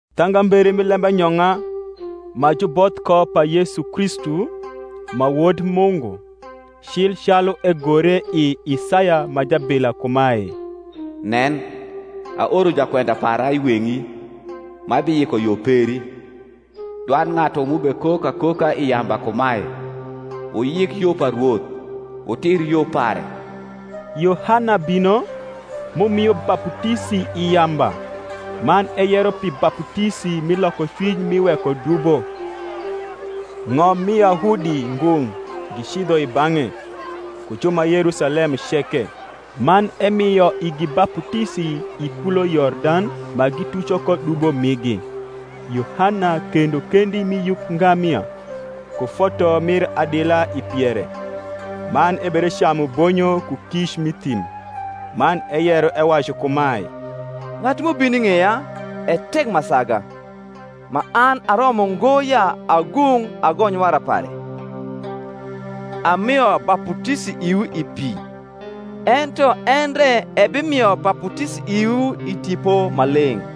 Thangambere mi lembanyong’a ma juboth ko pa Yesu Kristu, ma Wod Mungu. Cil calu egore i Isaya ma jabila kumae, Nen, aoro jakwenda para i weng’i, Ma biyiko yo peri; Dwand ng’atu m’ubekok akoka i yamba kumae, Wuyik yo pa Rwoth, Wutir yo pare; Yohana bino, m’umio baputisi i yamba man eyero pi baputisi mi lokocwiny mi wekodubo. Ng’ommiYahudi ngung’ gicidho i bang’e, ku ju ma Yerusalem ceke; man emio igi baputisi i kulo Yordan, ma gituco ko dubo migi. Yohana kendo kendi mi yuk ngamia, ku foto mir adila i piere, man ebedecamu bonyo ku kic m’i thim. Man eyero, ewacu kumae, Ng’atu m’ubino i ng’eya e tek ma saga, ma an aromo ngo ya agung’ agony wara pare. Amio baputisi iwu i pi; ento en re ebimio baputisi iwu i Tipo Maleng’.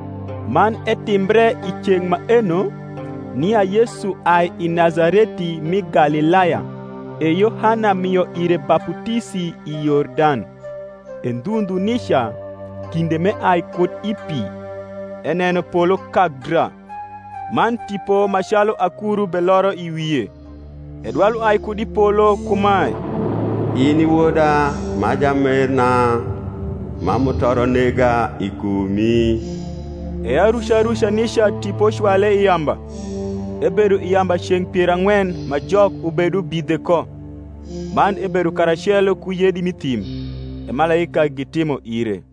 Man etimbre i ceng’ maeno, nia Yesu ai Nazareti mi Galilaya, e Yohana mio ire baputisi i Yordan. E ndhu ndhu nica kinde m’eai kud i pi, eneno polo kak dra, man Tipo ma calu akuru beloro i wie: e dwal uai kud i polo kumae, In i Woda ma jamerna, ma mutoro nega i kumi. E aruca ruca nica Tipo cwale i yamba. Ebedo i yamba ceng’ pier ang’wen ma Jok ubedubidhe ko; man ebedo karacelo ku yedi m’i thim; e malaika gitimo ire.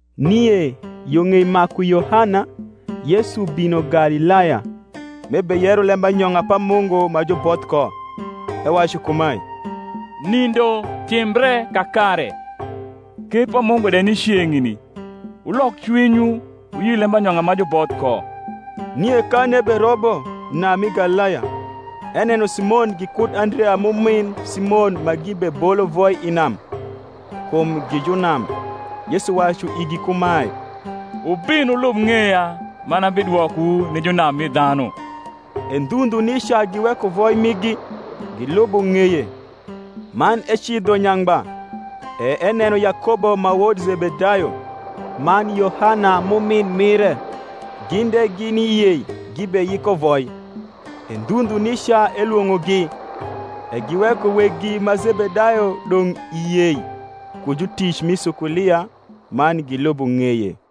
Nie yo ng’ei maku Yohana, Yesu bino Galilaya, m’ebeyero lembanyong’a pa Mungu ma juboth ko, ewacu kumae, Nindo timbre kakare, ker pa Mungu de ni ceng’ni: wulok cwinywu, wuyi lembanyong’a ma juboth ko. Nie kan eberobo nam mi Galilaya, eneno Simon gikud Andrea m’umin Simon ma gibebolo voi i nam; kum gi junam. Yesu wacu igi kumae, Wubin wulub ng’eya, man abidwokowu ni junam mi dhanu. E ndhu ndhu nica giweko voi migi, gilubo ng’eye. Man ecidho nyangba, e eneno Yakobo ma wod Zebedayo, man Yohana m’umin mire, gin de gini i yei gibeyiko voi. E ndhu ndhu nica elwong’ogi: e giweko weggi ma Zebedayo dong’ i yei ku jutic mi sukulia, man gilubo ng’eye.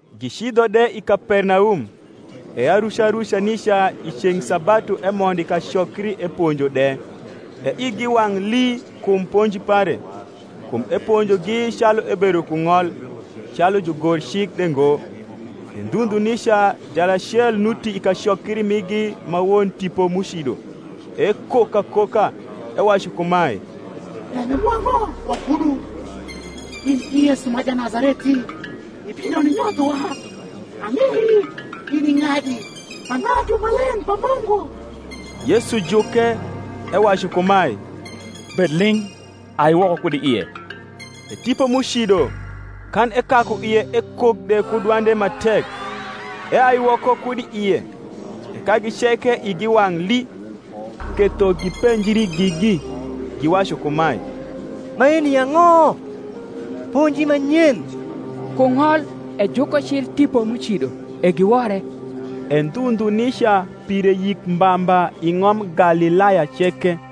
Gicidho de i Kapernaum; e aruca ruca nica i ceng’ sabatu emondo i kacokri eponjo de. E igi wang’ lii kum ponji pare: kum eponjogi calu ebedo ku ng’ol, calu jugorcik de ngo. E ndhu ndhu nica jalacel nuti i kacokri migi ma won tipo m’ucido; ekok akoka, ewacu kumae, Lembe mwa ang’o wakudu, in i Yesu ma Janazareti? ibino ninyothowa? ang’ei in i ng’adi, ma Ng’atu Maleng’ pa Mungu. Yesu juke, ewacu kumae, Bed ling’, ai woko kud i ie. E tipo m’ucido, kan ekaku ie ekok de ku dwande ma tek, eai woko kud i ie. E kagi ceke igi wang’ lii, ketho gipenjri gigi, giwacu kumae, Maeni ang’o? ponji ma nyen! ku ng’ol ejuko cil tipo m’ucido, e giwore. E ndhu ndhu nica pire yik mba mba i ng’om Galilaya ceke.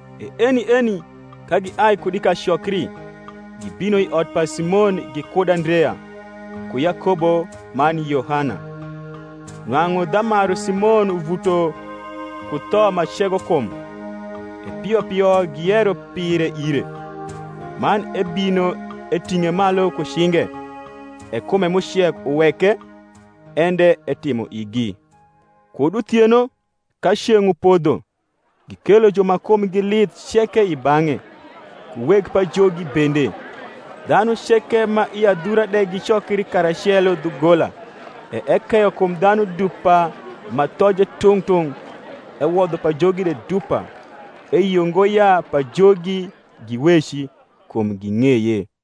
E eni eni, ka giai kud i kacokri, gibino i ot pa Simon gikud Andrea, ku Yakobo man Yohana. Nwang’u dhamaru Simon uvuto ku tho ma cego kum; e pio pio giyero pire ire: man ebino, eting’e malu ku cinge; e kume m’ucek uweke, en de etimo igi. Kud uthieno, ka ceng’ upodho, gikelo ju ma kumgi lith ceke i bang’e, ku weg pajogi bende. Dhanu ceke ma i adhura de gicokri karacelo dhugola. E ekeyo kum dhanu dupa ma thoje tung’ tung’, ewodho pajogi de dupa; eyio ngo ya pajogi giweci, kum ging’eye.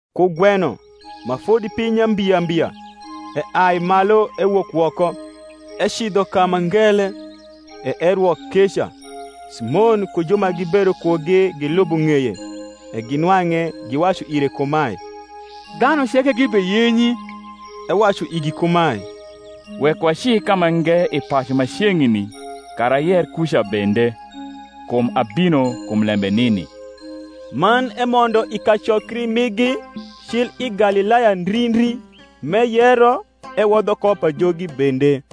Kugweno, ma fodi piny nyambiambia, eai malu ewok woko, ecidho ka ma ngele, e erwo keca. Simon ku ju ma gibedo kugi gilubo ng’eye; e ginwang’e, giwacu ire kumae, Dhanu ceke gi beyenyi. Ewacu igi kumae, Wek waci kamange i pacu ma ceng’ni, kara ayer kuca bende; kum abino kum lembe nini. Man emondo i kacokri migi cil i Galilaya ndri ndri, m’eyero ewodho ko pajogi bende.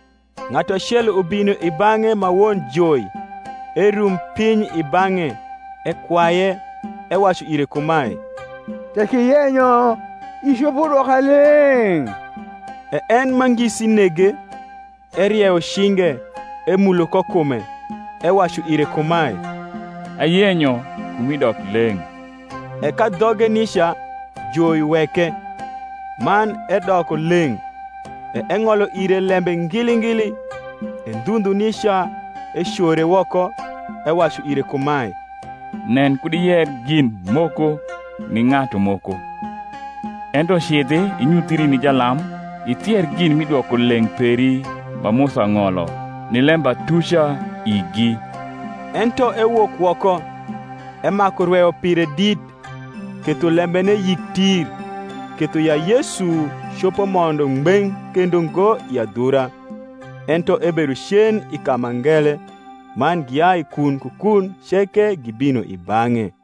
Ng’atu acel ubino i bang’e ma won joi, erum piny i bang’e, ekwaye, ewacu ire kumae, Tek iyenyo, icopo dwoka leng’. E en ma ngisi nege, erieyo cinge, emulo ko kume, ewacu ire kumae, Ayenyo; kumi dok leng’. E kadhoge nica joi weke, man edoko leng’. E eng’olo ire lembe ngili ngili, e ndhu ndhu nica ecore woko, ewacu ire kumae, Nen kud iyer gin moko ni ng’atu moko: ento cidhi inyuthri ni jalam, ithier gin mi dwokoleng’ peri ma Musa ng’olo, ni lembatuca igi. Ento ewok woko, emaku rweyo pire dit, ketho lembene yik tir, ketho ya Yesu copo mondo ngbeng’ kendo ngo i adhura, ento ebedo cen i ka ma ngele: man giai kun ku kun ceke gibino i bang’e.